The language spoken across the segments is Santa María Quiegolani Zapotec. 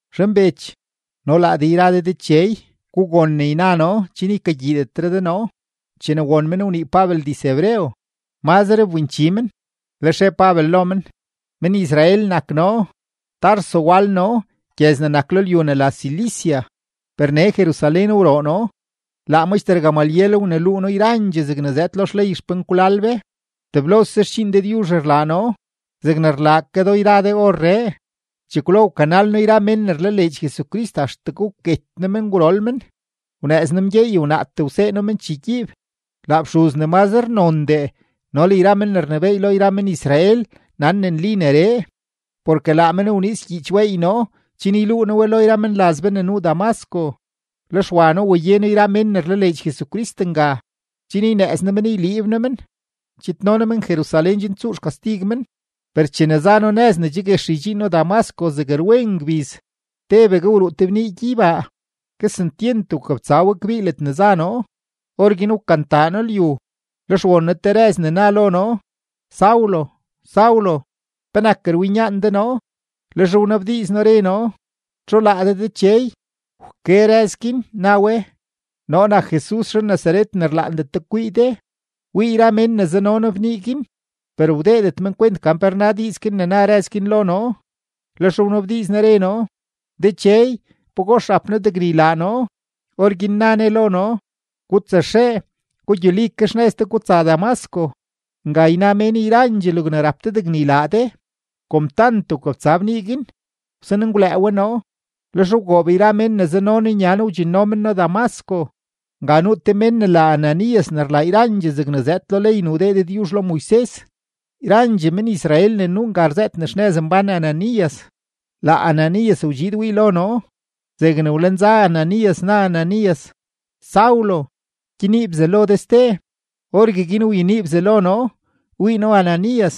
―Zhanbech no laa de yra de dechey, gugon ne yna noo chen ykagyiidetre de noo. Chene won men wnii Pabel diz-hebreo, mazre wbinchi men, lex re Pabel lo men: ―Men-Israel nak noo, Tarso wal noo gyëz ne nak lo lyu ne la Cilicia, per nee Jerusalén wroo noo; laa maxter Gamaliel wneluu noo yrandxee zegne zëëd lo xley xpenkwlal be. Teblose xdxiin Dëdyuzh rlaa noo zegne rlaa ke do yra de orree. Chekwlo wkanal noo yra mén ne rlaleedx Jesucrist axtegue wket noo men gwrol men; wnëëz noo mgyeey wnaatee wsee noo men chegyiib. Laa fxuz ne mazre nondee no le yra men ne rnebééy lo men-Israel nan ne nli neree. Porke laa men wniiz gyiich weey noo chen yluu noo we lo yra menlaz be ne nuu Damasco, lex wa noo waye noo yra mén ne rlaleedx Jesucrist nga, chen ynëëz noo men yliib noo men, chidno noo men Jerusalén chen tsuu xkastig men. ’Per chene za noo nëz ne che guex ydxiin noo Damasco zeg rwen ngbiz, tebegue wruu te bnii gyeybaa, kesentyent wkabtsa we kbii ledne za noo. Orguin wkantaa noo lyu, lex won noo te rëz ne na lo noo: “Saulo, Saulo, ¿penak rwinyaan de noo?” Lex wnabdiiz noo, re noo: “¿Txu laa de Dechey?” Wke rëz guin, na we: “Noo nak Jesus zhan-Nazaret ne rlaandet de kwii de.” Wii yra mén ne zano noo bnii guin, per wdeedet men kwent gan pe rna diiz ne na rëz guin lo noo. Lex wnabdiiz noo, re noo: “Dechey, ¿pagox rap noo degne ylaa noo?” Orguin na Ne lo noo: “Gutsaxee, gugyuli ke xnëz de gutsa Damasco. Nga yna mén yrandxee logne rap de degne ylaa de.” Kom tant wkabtsa bnii guin, wsan ngwlëë we noo, lex wgoob yra mén ne zano noo nya noo wdxinno men noo Damasco. ’Nga nuu te mén ne la Ananías ne rlaa yrandxee zegne zëëd lo ley ne wdee Dëdyuzh lo Moises. Yrandxee men-Israel ne nuu nga rzëët ne xnëz mbán Ananías. Laa Ananías wdxiid wii lo noo; zegne wlenza Ananías, na Ananías: “Saulo, gyenii bzalo de ste.” Orgueguin wyenii bzalo noo, wii noo Ananías.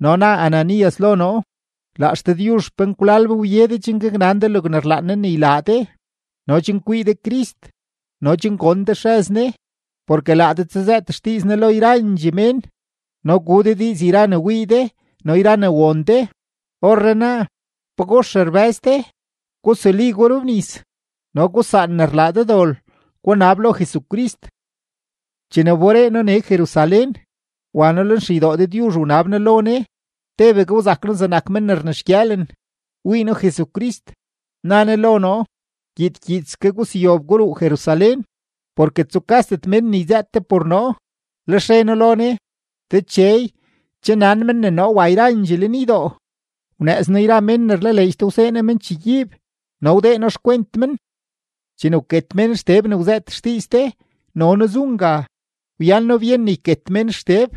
No na Ananías lo noo: “Laa XDëdyuzh xpenkwlal be wye de chen gaknan de logne rlaan Ne ne ylaa de no chen kwii de Crist no chen gon de xrëz Ne. Porke laa de tsazëët xdiiz Ne lo yrandxee mén no gu de diiz yra ne wii de no yra ne won de. Orrenaa, ¿pagox rbë́z de? Gusuli, gurobnis, no gusaan ne rlaa de dol, gunab lo Jesucrist.” ’Chene wberee noo nee Jerusalén, wa noo lenxeydoo Dëdyuzh wanab noo lo Ne, tebegue wzak noo zegnak men ne rnexgyëëlen. Wii noo Jesucrist, na Ne lo noo: “Gyiid gyiidske guseyob guruu Jerusalén, porke tsukasdet mén ne yzëët de por noo.” Lex re noo lo Ne: “Dechey, che nan men ne noo wa yrandxee lenydoo, wnëëz noo yra mén ne rlaleedx de wsee noo men chegyiib no wdee noo xkwent men. Chene wket mén Xteb ne wzëët xdiiz de, no noo zu nga, wyan noo byen ne yket mén Xteb;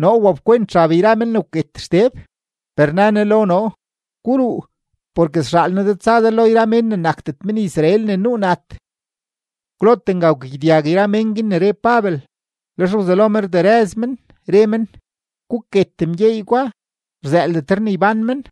noo wapkwent xab yra mén ne wket Xteb.” Per na Ne lo noo: “Guruu, porke sxaal noo de tsa de lo yra mén ne nakdet men-Israel ne nuu nat.” Kwlote nga wkagyedyag yra mén guin ne re Pabel, lex wzelo men rderëz men, re men: ―¡Guket mgyeey gwa! ¡Rzëëldetre ne ybán men!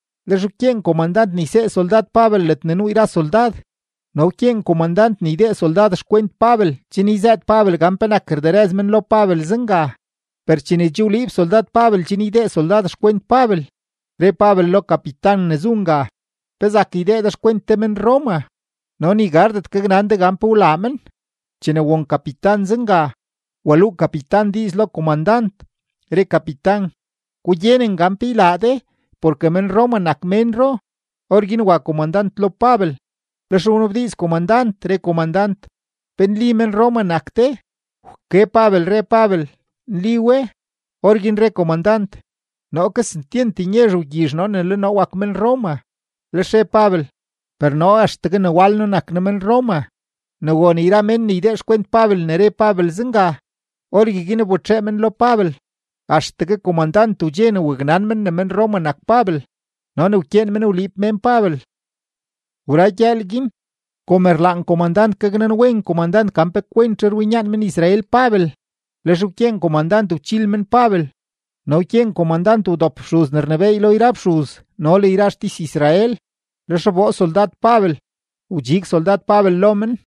lex wkyeen komandant ne ysee soldad Pabel ledne nuu yra soldad no wkyeen komandant ne ydee soldad xkwent Pabel chen yzëët Pabel gan penak rderëz men lo Pabel zenga. Per chene che wliib soldad Pabel chen ydee soldad xkwent Pabel, re Pabel lo kapitan ne zu nga: ―¿Pe zak ydee de xkwent te men-Roma, no ni gardet gaknan de gan pe wlaa men? Chene won kapitan zenga, waluu kapitan diiz lo komandant, re kapitan: ―Gugyenen gan pe ylaa de porke men-Roma nak ménro. Orguin wa komandant lo Pabel, lex wnabdiiz komandant, re komandant: ―¿Pe nli ne men-Roma nak de? Wke Pabel, re Pabel: ―Nli we. Orguin re komandant: ―Noo kesentyent nyezh wgyizh noo ne le noo wak men-Roma. Lex re Pabel: ―Per noo axtegue ne wal noo nak noo men-Roma. Ne won yra men ne ydee xkwent Pabel ne re Pabel zenga, orgueguin wbetxee men lo Pabel. Axtegue komandant wdxe ne waknan men ne men-Roma nak Pabel no ne wkyeen men wliib mén Pabel. Wra gyëël guin, kom rlaan komandant gaknanwen komandant gan pe kwentzhe rwinyaan men-Israel Pabel, lex wkyeen komandant wchil men Pabel no wkyeen komandant wdop fxuz ne rnebééy lo yra fxuz no le yra xtis-Israel. Lex wboo soldad Pabel, wdxig soldad Pabel lo men.